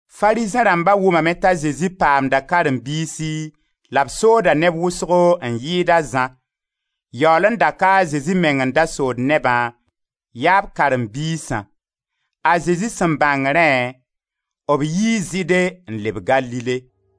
Farizẽ rãmba wʋmame t'a Zezi paamda karen-biisi la b sooda neb wʋsgo n yɩɩd a Zã, — yaool n da ka a Zezi meng n da sood nebã, yaa b karen-biisã. — A Zezi sẽn bãng rẽ, b yi Zɩɩde n leb Galile.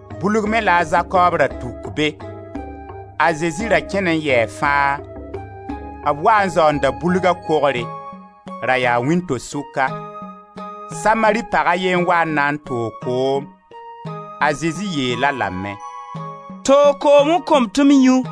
Bulg me la a Zakoob ra tuk be. A Zezi ra kẽn n yɛɛ fãa; b waa n zaoonda bulga kogre. Ra yaa wĩnto-sʋka. Samari pag a ye n wa n na n toog koom. A Zezi yeel-a lame: «Toog koom n kõ-m tɩ m yũ.»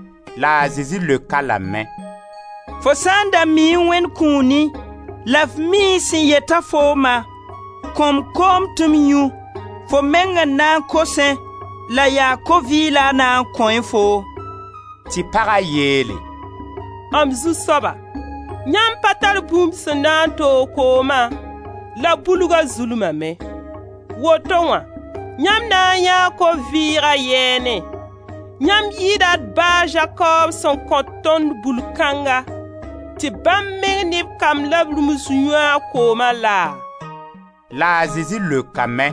La a Zezi leok-a lame: «Fo sã n da miẽ Wẽnd kũuni, la f miẽ sẽn yet-a fooma: Kõ-m koom tɩ m yũ, fo meng n na n kosẽ, la yaa ko vɩɩg la a na n kõẽ foo.» Tɩ paga yeele: «M zu-soaba! Yãmb pa tar bũmb sẽn na n toog kooma, la bulga zulmame, woto wã yãmb na n yãee ko-vɩɩga yɛɛnẽ? Yãmb yɩɩda d ba a Zakoob sẽn kõ tõnd bul kãnga, tɩ bãmb meng ne b kamb la b rũmsa yũ a kooma laa?» La a Zezi leokame: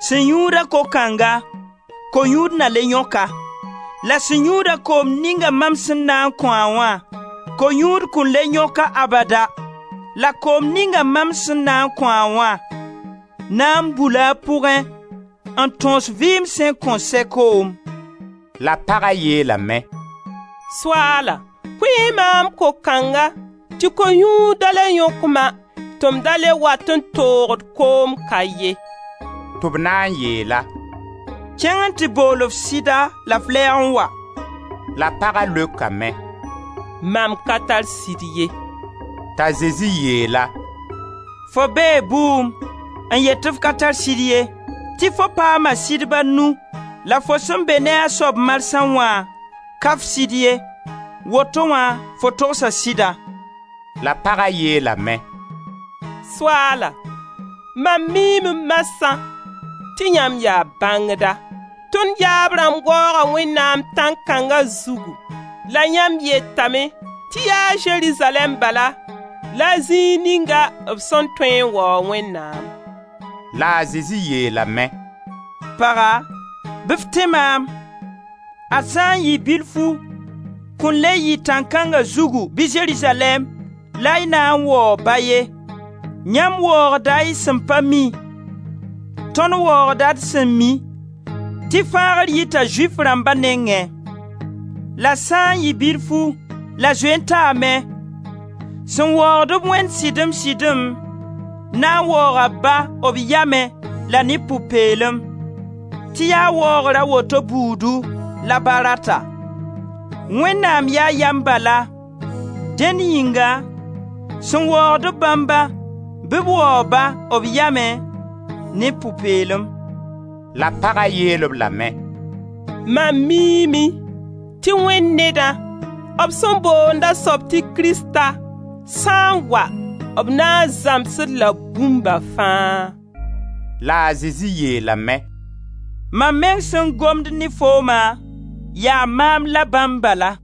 «Sẽn yũud-a ko kãnga, ko-yũud na le yõk-a. La sẽn yũud-a koom ninga mam sẽn na n kõ-a wã, ko-yũud kõn le yõk-a abada; la koom ninga mam sẽn na n kõ-a wã na n bula a pʋgẽ n tãoos vɩɩm sẽn kõn sɛ koom.» La paga yeelame: «Soaala, kõ-y maam ko kãnga tɩ ko-yũud da le yõk ma, tɩ m da le wat n toogd koom ka ye.» Tɩ b na n yeel-a: «Kẽng n tɩ bool f sɩda la f lɛɛg n wa.» La paga leokame: «Mam ka tar sɩd ye.» T'a Zezi yeel-a: «Fo bee bʋʋm n yet tɩ f ka tar sɩd ye. Tɩ fo paama sɩdb a nu, la fo sẽn be ne a soab marsã wã, ka f sɩd ye; woto wã fo togsa sɩda.» La paga yeelame: «Soaala, mam miime marsã tɩ yãmb yaa bãngda. Tõnd yaab rãmb waooga Wẽnnaam tãn-kãnga zugu, la yãmb yetame tɩ yaa Zerizalɛɛm bala la zĩig ninga b sẽn tõe n waoog Wẽnnaam.» La a Zezi yeelame: «Paga, bɩ f tẽ maam, ad sã n yɩ bilfu kõn le yɩ tãn-kãnga zugu bɩ Zerizalɛɛm, la y na n waoog Ba ye. Yãmb waoogda y sẽn pa mi. Tõnd waoogda d sẽn mi, tɩ fãagr yita Zʋɩf rãmba nengẽ. La sã n yɩ bilfu — la zoe n taame — sẽn waoogd-b Wẽnd sɩdem-sɩdem, na n waooga Ba b yamẽ la ne pʋ-peelem, tɩ yaa waoogr a woto buudu la Ba rata. Wẽnnaam yaa yam bala, Dẽn yĩnga sẽn waoogd-b bãmbã, bɩ b waoog-ba b yamẽ, ne pʋ-peelem.» La paga yeel-b lame: «Mam miime tɩ Wẽnd Nedã, b sẽn boond a soab tɩ Krista, sã n wa, b na n zãms-d-la bũmba fãa.» La a Zezi yeelame: «Mam meng sẽn gomd ne fooma, yaa maam la bãmb bala.»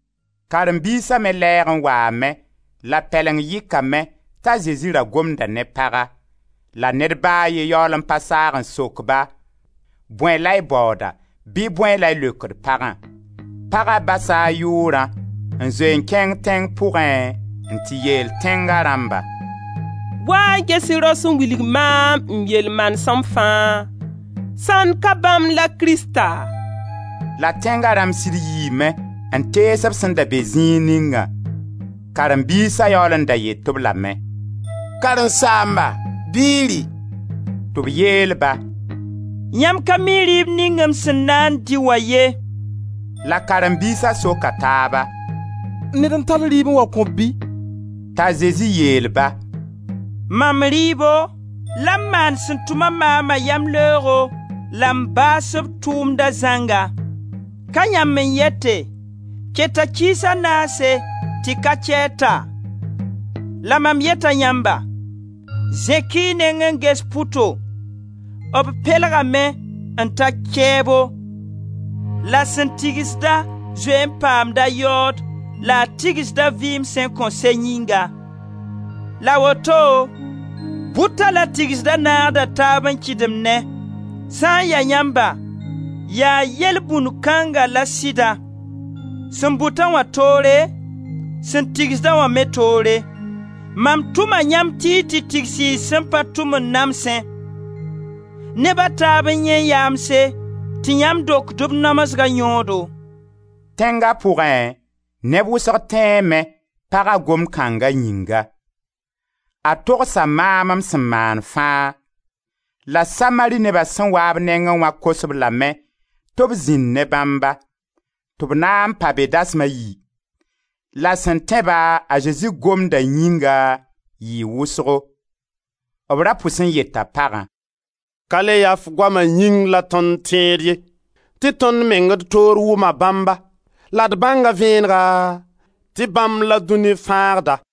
Karen-biisa me lɛɛg n waame, la b pɛleng yɩkame t'a Zezi ra gomda ne paga; la ned ba a ye yaool n pa saag n sok-ba: «Bõe la y baooda?» bɩ «Bõe la y leokd pagã?» Paga basa a yʋʋrã n zoe n kẽng tẽng pʋgẽ n tɩ yeel tẽnga rãmba: «Wa-y n ges rao sẽn wilg maam m yel-manesem fãa, sãnd ka bãmb la Krista?» La tẽnga rãmb sɩd yiime n tees b sẽn da be zĩig ningã. Karen-biisa yaool n da yet-b lame: «Karen-saamba, bɩ y rɩ!» Tɩ b yeel-ba: «Yãmb ka mi rɩɩb ning m sẽn na n dɩ wã ye!» La Karen-biisa soka taaba: «Ned n tall rɩɩb n wa kõ-b bɩ?» T'a Zezi yeel-ba: «Mam rɩɩbo, la m maan sẽn tʋma maama yamleoogo la m baas b tʋʋmda zãnga. Ka yãmb n yete: ‹Keta kiis a naase tɩ ka-kɛɛr ta?› La mam yeta yãmba: zẽk-y y neng n ges pʋto, b pelgame n ta kɛɛbo. La sẽn tigsd-a zoe n paamda a yaood, la a tigsda vɩɩm sẽn kõn sɛ yĩnga, la woto bʋta la tigsda naagda taab n kɩdemnẽ. Sã n ya yãmba, yaa yelbũnd kãnga la sɩda: sẽn bʋta wã toore, sẽn tigsda wã me toore. Mam tʋma yãmb tɩ y tigsi y sẽn pa tʋm n namsẽ. Neb a taab n yãee yaamse tɩ yãmb dokd b namsga yõodo.» Tẽnga pʋgẽ, neb wʋsgo tẽeme, paga gomd kãnga yĩnga: «A togsa maam m sẽn maan fãa.» La Samari neba sẽn wa b nengẽ wã kos-b lame tɩ b zĩnd ne bãmba; tɩ b na n pa be dasma a yi. La sẽn tẽ-ba, a Zezi gomdã yĩng, yɩɩ wʋsgo. B ra pus n yeta pagã: «Ka le ya f goama yĩng la tõnd tẽed ye tɩ tõnd meng d toore wʋma bãmba la d bãnga vẽenega tɩ bãmb la dũni Fãagda.»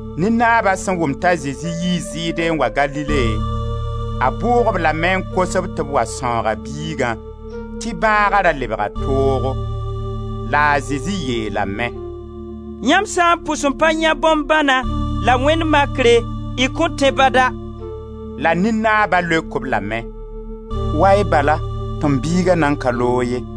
Nin-naaba sẽn wʋm t'a Zezi yii Zɩɩde n wa Galile, a bʋʋg-b lame n kos-b tɩ b wa sãoog a biigã tɩ bãaga ra lebga toogo. La a Zezi yeelame: «Yãmb sã n pʋs n pa yãe bõn-bãna, la wẽnd makre y kõn tẽ bada!» La nin-naaba leok-b lame: «Wa-y bala tɩ m biiga nan ka loog ye.»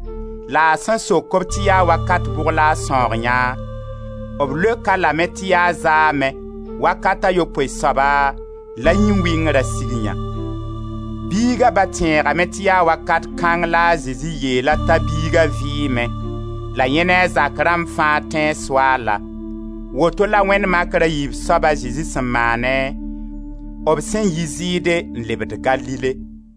La a sẽn sok-b tɩ yaa wakat bʋg la a sãoog yã, b leok-a lame tɩ yaa zaame, wakat a yopoe soaba la a yĩn-wɩngra sig yã. Biiga ba tẽegame tɩ yaa wakat kãng la a Zezi yeel-a t'a biiga vɩɩme, la yẽ ne a zak rãmb fãa tẽe Soaalã. Woto la wẽnd makr a yiib soaba a Zezi sẽn maane b sẽn yi Zɩɩde n lebd Galile.